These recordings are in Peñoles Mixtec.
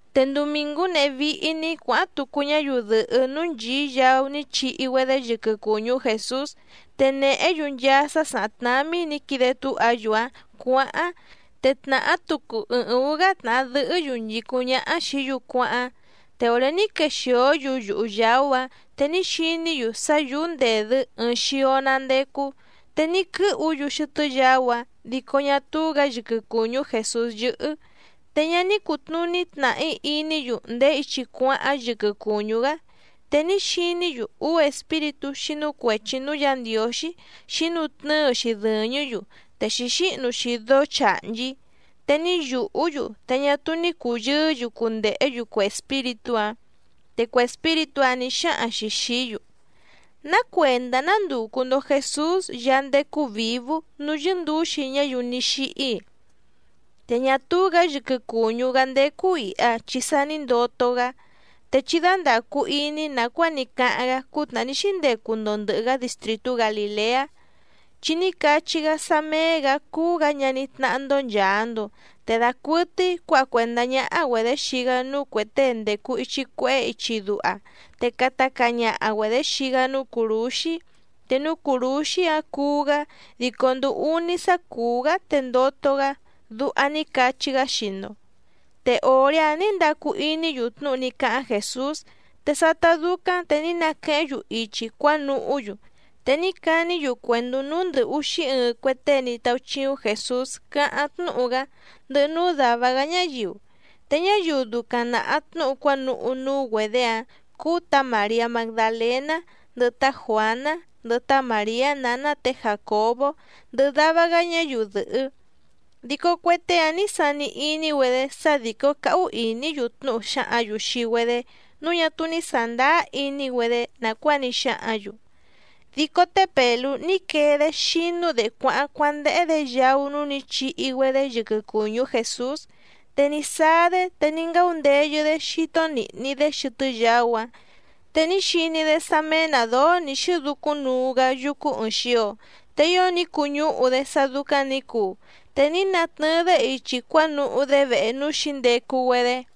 Te ndumìngú nehé víhí‑ní cuǎháⁿ tucu ñáyiu dɨ̀hɨ́ núú nchìí yaú ní chihi‑güedé yɨquɨ cùñú Jèsús, te nèhé‑yu nchaa sá sàháⁿ tnámí nǐ quide túha‑yu‑áⁿ cuǎháⁿ, te tnàhá tucu ɨɨⁿ ǔú‑gá tnàha dɨhɨ́‑yu nchìcúⁿ ñáhá xìí‑yu cuáháⁿ. Te òré ní quexìó‑yu yuhu yàú‑áⁿ te ní xiní‑yu sá yǔú ndèdɨ́ ɨɨⁿ xio‑ná ndécú, te ní quɨ́hu‑yu xɨtɨ́ yaú‑áⁿ, dico ñá túú‑gǎ yɨquɨ cùñú Jèsús yɨ́hɨ́. Te ñá ní cùtnuní tnàhí iní‑yu ndèé ichi cuáháⁿ yɨquɨ cùñú‑gá, te ní xiní‑yu úú espíritú xínú cuèchi núú Yǎ Ndiǒxí xǐnutnɨ́ɨ‑xi dɨ̀ñɨ́‑yu te xǐxíhnu‑xi dóó chàhnchí. Te ní yùhú‑yu te ñá túú ní cùyɨɨ́‑yu cundèhé‑yu cue espíritú‑áⁿ, te cue espíritú‑áⁿ nǐ xáhaⁿ‑xi xìí‑yu: —¿Ná cuèndá nándùcu‑ndo Jesús Yaá ndécú vǐvú núú yɨ́ndǔxi ñáyiu ní xíhí‑i? Te ñá túú‑gǎ yɨquɨ cùñú‑gá ndécú ìha chi sa ní ndoto‑gá, te chí dándàcu iní nàcuáa ní cáháⁿ‑gá cútnàhá ní xíndecu‑ndo ndɨ̀hɨ‑gá distrìtú Galìleá, chi ní cachí‑gá sá méé‑gǎ cúú‑gǎ ñaní tnáhá‑ndó nchàa‑ndo, te dacuɨtɨ́í cuǎha cuèndá ñáhá‑güedě xii‑gá núú cuè tée ndècu ichi cuehé ichi duha, te cata caa ñaha‑güedě xii‑gá núú cùrúxí, te núú cùrúxí‑áⁿ cuú‑gá dico nduu úní sá cùú‑gá te ndoto‑gá, duha ní cachí‑gá xii‑ndo. Te òré‑áⁿ nǐ ndacu iní‑yu tnúhu ní cáháⁿ Jèsús. Te sátá dúcáⁿ te ní naquehéⁿ‑yu ichi cuánuhú‑yu, te ní caní‑yu cuèndú núú ndɨ̀ úxí ɨɨⁿ cue tée ní táúchíúⁿ Jèsús cáháⁿ tnúhu‑gá, ndɨhɨ núú dàva‑gá ñáyiu. Te ñáyiu ducaⁿ nàha tnúhu cuánuhú núú‑güedě‑áⁿ cúú tǎ Màriá Magdalèná, ndɨhɨ tá Juǎná, ndɨhɨ tá Màriá nǎná tě Jàcobó, ndɨhɨ dava‑gá ñáyiu dɨ̀hɨ́. Dico cue tée‑áⁿ nǐ sani iní‑güedé sá dìcó cáhú ìní‑yu tnúhu xǎhǎⁿ‑yu xii‑güedé nǔu ñá túú ní sàndáá iní‑güedé nàcuáa ní xáhǎⁿ‑yu. Dico té Pèlú ní quee‑dé xínú‑dě cuáháⁿ cuándéhé‑dě yaú núú nǐ chihi‑güedé yɨquɨ cùñú Jèsús, te ní sáá‑dé te ní ngáundeyɨ‑dé xító nìhni‑dé xɨtɨ́ yaú‑áⁿ te ní xiní‑dé sá méé‑nǎ dóó nǐ xɨ́ducúⁿ nuu‑gá yúcú ɨ̀ɨⁿ xio, te ío ní cuñúhu‑dé sá dúcáⁿ nǐ cuu, te ní natnɨɨ‑dé ichi cuánuhú‑dé vehe núú xǐndecu‑güedé.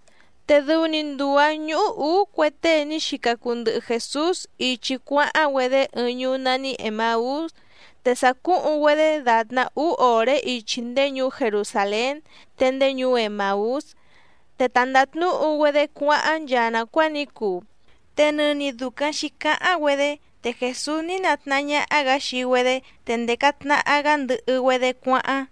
Te dɨu‑ni nduu‑ǎⁿ ñúhú ǔú cue tée ní xica cuu ndɨhɨ Jèsús ichi cuáháⁿ‑güedé ɨɨⁿ ñuú nání Emàús, te sàcúhuⁿ‑güedé dàtná úú òré ichi ndéé ñuú Jerusàlén, te ndéé ñuú Emàús. Te ta ndàtnúhu‑güedé cuáháⁿ nchaa nàcuáa ní cuu, te nɨni dùcaⁿ xícáháⁿ‑güedé, te Jèsús ní natnahá ñáhá‑gǎ xii‑güedé te ndèca tnaha‑gá ndɨhɨ‑güedé cuáháⁿ.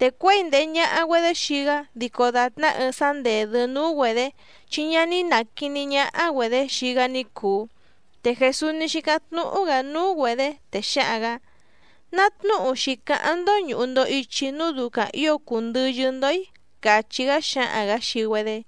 Te cuěi ndèhe ñaha‑güedé xii‑gá dico dàtná ɨɨⁿ sá ndèdɨ́ núú‑güedě, chi ñá ná quìní ñáhá‑güedě xii‑gá ní cùu. Te Jèsús ní xícáⁿ tnúhú‑gǎ núú‑güedě, te xáhaⁿ‑gǎ: —¿Ná tnúhu xǐcáháⁿ‑ndó ñùhu‑ndo ichi núu ducaⁿ ǐo cùu ndɨyɨ́‑ndó‑í? —càchí‑gá xáhaⁿ‑gǎ xii‑güedé.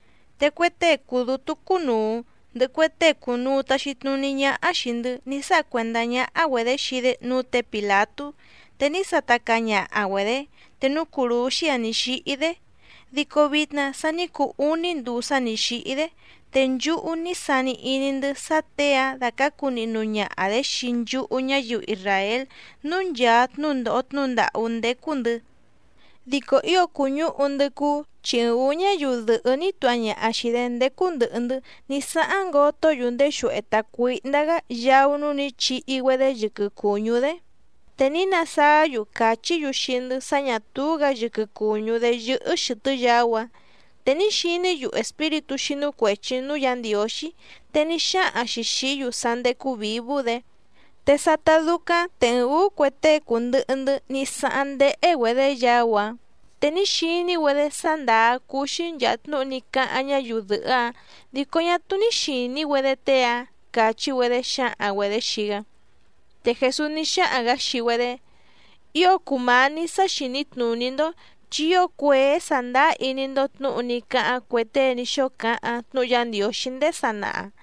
Te cue tée cùu dútú cúnùu, ndɨhɨ cue tée cùnuu taxi tnuní ñáhá xìi‑ndɨ́ ní sáha cuèndá ñáhá‑güedě xii‑dé núú tě Pìlatú te ní sata caa ñaha‑güedě te núú cùrúxí‑áⁿ nǐ xíhí‑dé. Dico vitna sa ní cuu úní nduu sá nǐ xíhí‑dé, te nchúhú ní sani iní‑ndɨ́ sá těe‑áⁿ dàcácu nihnu ñaha‑dě xii nchúhú ñáyiu isràél núú nchàa tnúndòho tnúhu ndàhú ndécú‑ndɨ̌. Dico ío cùñúhu‑ndɨ́ cúú, chi ɨɨⁿ ǔú ñáyiu dɨ̀hɨ́ ní tuha ñaha xìi‑dé ndécú ndɨ̀hɨ‑ndɨ́ ní sáháⁿ ngotó‑yu ndéxuehe tàcuíhndá‑gá yaú núú nǐ chihi‑güedé yɨquɨ cùñú‑dé, te ní nasáá‑yu càchí‑yu xii‑ndɨ́ sá ñà túú‑gǎ yɨquɨ cùñú‑dé yɨ́hɨ́ xɨ̀tɨ́ yaú‑áⁿ. Te ní xiní‑yu espíritú xínú cuèchi núú Yǎ Ndiǒxí, te ní xáhaⁿ‑xi xìí‑yu sá ndécú vǐvú‑dě. Te sátá dúcáⁿ te ɨɨⁿ ǔú cue tée cùndɨhɨ‑ndɨ́ ní sáháⁿ ndéhé‑güedě yaú‑áⁿ, te ní xiní‑güedé sá ndàá cúú‑xí nchàa tnúhu ní cáháⁿ ñáyiu dɨ̀hɨ́‑áⁿ, dico ñá túú ní xìní‑güedé tée‑áⁿ —càchí‑güedé xǎhaⁿ‑güedě xii‑gá. Te Jèsús ní xáhaⁿ‑gǎ xii‑güedé: —¡Ío cùmání sǎ xìní tnùní‑ndó, chi ío cuèé sàndáá iní‑ndó tnǔhu ní cáháⁿ cue tée ní xóo cáháⁿ tnúhu Yá Ndiǒxí ndéé sanaha!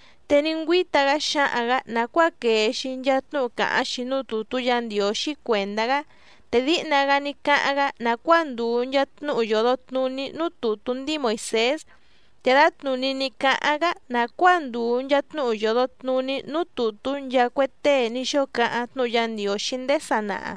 Te ní ngüíta‑gá xáhaⁿ‑gǎ nàcuáa quèe‑xi nchaa tnúhu càháⁿ‑xi núú tùtú Yǎ Ndiǒxí cuèndá‑gá, te díhna‑gá ní cáháⁿ‑gá nàcuáa ndùu nchaa tnúhu yòdo tnuní núú tùtú ndíi Moìsés, te dǎtnùní ní cáháⁿ‑gá nàcuáa ndùu nchaa tnúhu yòdo tnuní núú tùtú nchaa cue tée ní xóo cáháⁿ tnúhu Yá Ndiǒxí ndéé sanaha.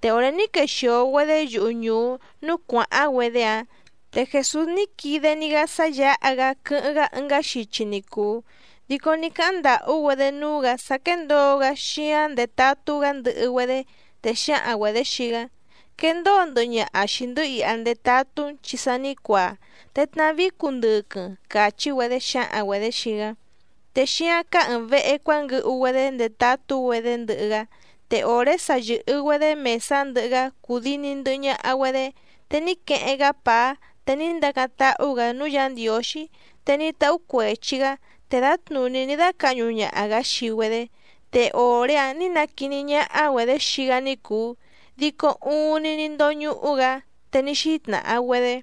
Te òré ní quexìo‑güedé yuhu ñùú núú cuàháⁿ‑güedé‑áⁿ, te Jèsús ní quide‑ni‑gá sá yǎha‑gá quɨ́hɨ́ⁿ‑gá ɨngá xichi ni cùu. Dico ní cáháⁿ ndàhú‑güedé núú‑gǎ sá quéndǒo‑gá xíáⁿ ndetatú‑gá ndɨhɨ‑güedé, te xǎhaⁿ‑güedě xii‑gá: —Quendóo ndɨhɨ ñaha xìi‑ndɨ́ iha ndetatú‑n chi sa ní cuaa, te tnavíí cundɨquɨⁿ —càchí‑güedé xǎhaⁿ‑güedě xii‑gá. Te xíáⁿ cáá ɨ̀ɨⁿ vehe cuánguɨhu‑güedé ndetatú‑güedé ndɨhɨ‑gá. Te òré sa yɨ̀hɨ‑güedé mèsá ndɨhɨ‑gá cùdini ndɨhɨ ñaha‑güedé, te ní queheⁿ‑gá pàá te ní ndacáⁿ táhú‑gǎ núú Yǎ Ndiǒxí, te ní táhú cuèchi‑gá te dǎtnùní ní dácǎhñu ñaha‑gǎ xii‑güedé. Te òré‑áⁿ nǐ naquiní ñáhá‑güedě xii‑gá ní cùu, dico uuⁿni ní ndóñúhú‑gǎ. Te ní xítnàha‑güedé: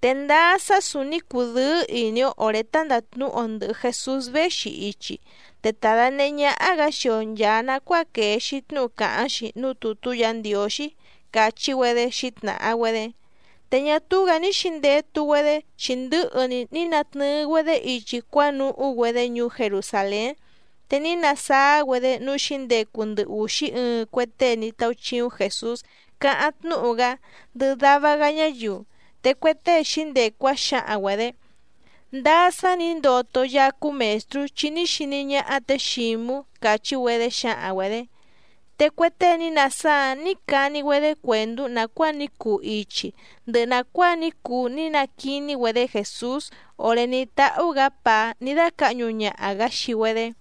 —Te ndáá sá sǔúní cùdɨ́ɨ́ ìní‑ó òré tá ndàtnúhu‑o ndɨ̀hɨ Jesús véxi ichi, te ta dànehé ñáhá‑gǎ xii‑o nchàa nacuáa quèe‑xi tnúhu càháⁿ‑xi núú tùtú Yǎ Ndiǒxí —càchí‑güedé xǐtnàha‑güedé. Te ñá túú‑gǎ ní xǐndetu‑güedé chi ndɨ̌hɨ‑ni ní natnɨɨ‑güedé ichi cuánuhú‑güedé ñuú Jerusàlén, te ní nasáá‑güedé núú xǐndecu ndɨ ùxí ɨɨⁿ cue tée ní táúchíúⁿ Jèsús cáháⁿ tnúhu‑gá, ndɨhɨ dava‑gá ñáyiu. Te cue tée xǐndecu‑áⁿ xǎhaⁿ‑güedě: —Ndáá sá nǐ ndoto Yaá cúú Mèstrú, chi ní xiní ñáhá tě Xǐmú —càchí‑güedé xǎhaⁿ‑güedě. Te cue tée ní nasáá‑áⁿ nǐ cani‑güedé cuèndú nàcuáa ní cuu ichi, ndɨhɨ nàcuáa ní cuu ní naquiní‑güedé Jèsús òré ní táhú‑gǎ pàá ní dácǎhñu ñaha‑gǎ xii‑güedé.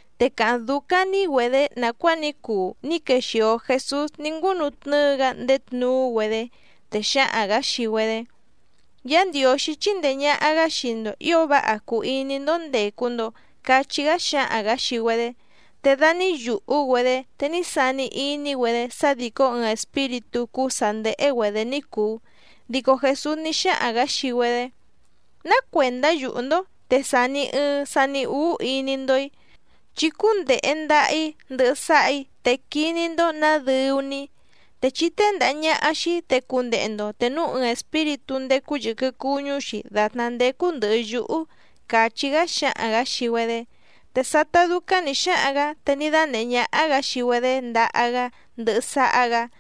Te càháⁿ dúcáⁿ‑ní‑güedě nàcuáa ní cuu ní quexìo Jesús ní ngúnutnɨ́ɨ‑gá ndéé tnuú‑güedé, te xáhaⁿ‑gǎ xii‑güedé: —Yá Ndiǒxí chíndèe ñaha‑gá xii‑ndo ǐo váha cùu iní‑ndó ndècu‑ndo —cachí‑gá xáhaⁿ‑gǎ xii‑güedé. Te da ní yùhú‑güedé, te ní sani iní‑güedé sá dìcó ɨɨⁿ espíritú cúú sǎ ndéhé‑güedě ní cùu. Dico Jèsús ní xáhaⁿ‑gǎ xii‑güedé: —¿Ná cuèndá yùhú‑ndó, te sàni ɨɨⁿ sani úú iní‑ndó‑í? Chí cúndèhe ndaha‑í ndɨhɨ sáhà‑í te quiní‑ndó nǎ dɨu‑ni‑í. Te chí téndàha ñaha xii‑í te cundehe‑ndo, te núu ɨɨⁿ espíritú ndécú yɨ̀quɨ cuñú‑xi dàtná ndécú ndɨ̀hɨ yúhú —càchí‑gá xáhaⁿ‑gǎ xii‑güedé. Te sátá dúcáⁿ nǐ xáhaⁿ‑gǎ te ní dánèhé ñáhá‑gǎ xii‑güedé ndaha‑gá ndɨhɨ sáhá‑gǎ.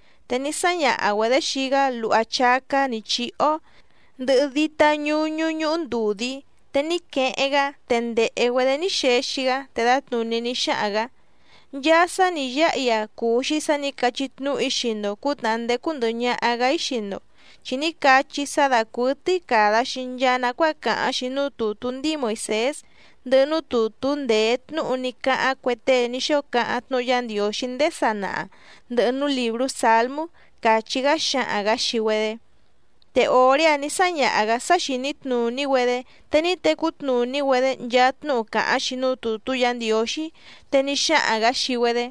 Te ní sáñaha‑güedě xii‑gá luha chácá nǐ chíhó, ndɨhɨ dítá ñǔñú ñúhú ndùdí, te ní queheⁿ‑gá te ndèhe‑güedé ní xexi‑gá. Te dǎtnùní ní xáhaⁿ‑gǎ: —Nchaa sá nǐ yáha‑í‑a cùu‑xi sá nǐ cachí tnúhu‑í xii‑ndo cǔtnàhá ndécú ndɨ̀hɨ ñaha‑gá‑í xii‑ndo, chi ní cachí‑í sá dàcuɨtɨ́í càda‑xi nchaa nacuáa càháⁿ‑xi núú tùtú ndíi Moìsés, ndɨhɨ núú tùtú ndèé tnúhu ní cáháⁿ cue tée ní xóo cáháⁿ tnúhu Yá Ndiǒxí ndéé sanaha, ndɨhɨ núú lìbrú Sǎlmú —càchí‑gá xáhaⁿ‑gǎ xii‑güedé. Te òré‑áⁿ nǐ sáñaha‑gǎ sá xìní tnùní‑güedé, te ní tecú tnùní‑güedé nchaa tnúhu càháⁿ‑xi núú tùtú Yǎ Ndiǒxí. Te ní xáhaⁿ‑gǎ xii‑güedé: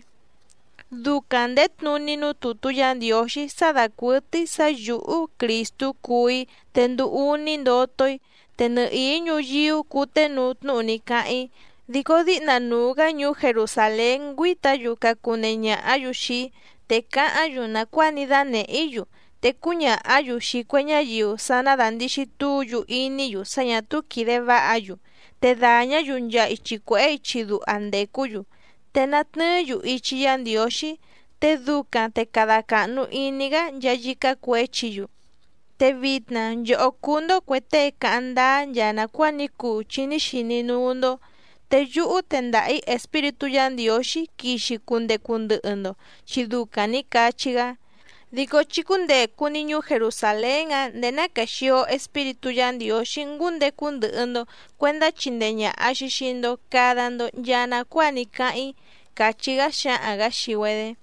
—Ducaⁿ ndèé tnuní núú tùtú Yǎ Ndiǒxí sá dàcuɨtɨ́í sǎ yǔhú Crìstú cuú‑í, te nduu úní ndoto‑í. Te nɨhìí ñuyíú cùténuu tnúhu ní cáháⁿ‑í, dico díhna nuu‑gǎ ñuú Jerusàlén ngüíta‑yu cacunehe ñàhá‑yu xii‑í, te cáháⁿ‑yu nàcuáa ní dánèhé‑í‑yu, te cúñàhá‑yu xii cue ñáyiu sá ná dàndixi túu‑yu iní‑yu sá ñà túú quìde váha‑yu, te dàñá‑yu nchaa ichi cuèhé ichi duha ndècú‑yu, te natnɨɨ́‑yu ichi Yá Ndiǒxí, te ducaⁿ te cada càhnu iní‑gá nchaa yícá cuěchi‑yu. Te vitna nchòhó cuu‑ndo cuè tée cáháⁿ ndáá nchaa nàcuáa ní cuu chi ní xiní núú‑ndó. Te yúhú tendaha‑ǐ Espíritú Yǎ Ndiǒxí quixi cundecu ndɨhɨ‑ndo, chi ducaⁿ nǐ cachí‑gá. Dico chí cúndècu‑ni ñuú Jerusàlén‑áⁿ ndèé ná quèxio Espíritú Yǎ Ndiǒxí ngúndecu ndɨhɨ‑ndo cuèndá chindee ñàha‑xi xii‑ndo cada‑ndo nchaa nacuáa ní cáháⁿ‑í —càchí‑gá xáhaⁿ‑gǎ xii‑güedé.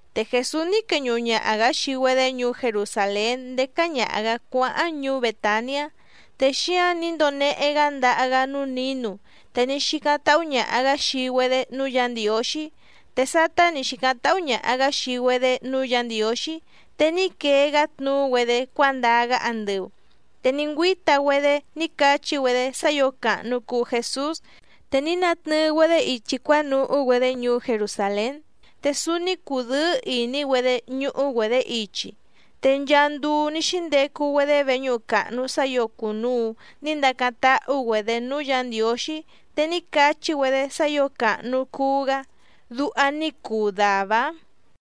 Te Jèsús ní queñuhu ñaha‑gǎ xii‑güedé ñuú Jerusàlén ndécá ñàha‑gá cuáháⁿ ñuú Bètaniá, te xíáⁿ nǐ ndonehe‑gá ndaha‑gá núú nǐnu, te ní xícáⁿ táhú ñàha‑gá xii‑güedé núú Yǎ Ndiǒxí. Te sátá nǐ xícáⁿ táhú ñàha‑gá xii‑güedé núú Yǎ Ndiǒxí, te ní quee‑gá tnuú‑güedé cuándaa‑gá andɨu. Te ní ngüíta‑güedé ní cachí‑güedé sá ǐo càhnu cuu Jesús, te ní natnɨɨ‑güedé ichi cuánuhú‑güedé ñuú Jerusàlén, te súúní cùdɨ́ɨ́ ìní‑güedé ñúhú‑güedě ichi. Te nchaa nduu ní xíndecu‑güedé veñúhu càhnu sá ǐo cùnuu ní ndacáⁿ táhú‑güedě núú Yǎ Ndiǒxí, te ní cachí‑güedé sá ǐo càhnu cuu‑gá. Duha ní cuu dàvá‑áⁿ.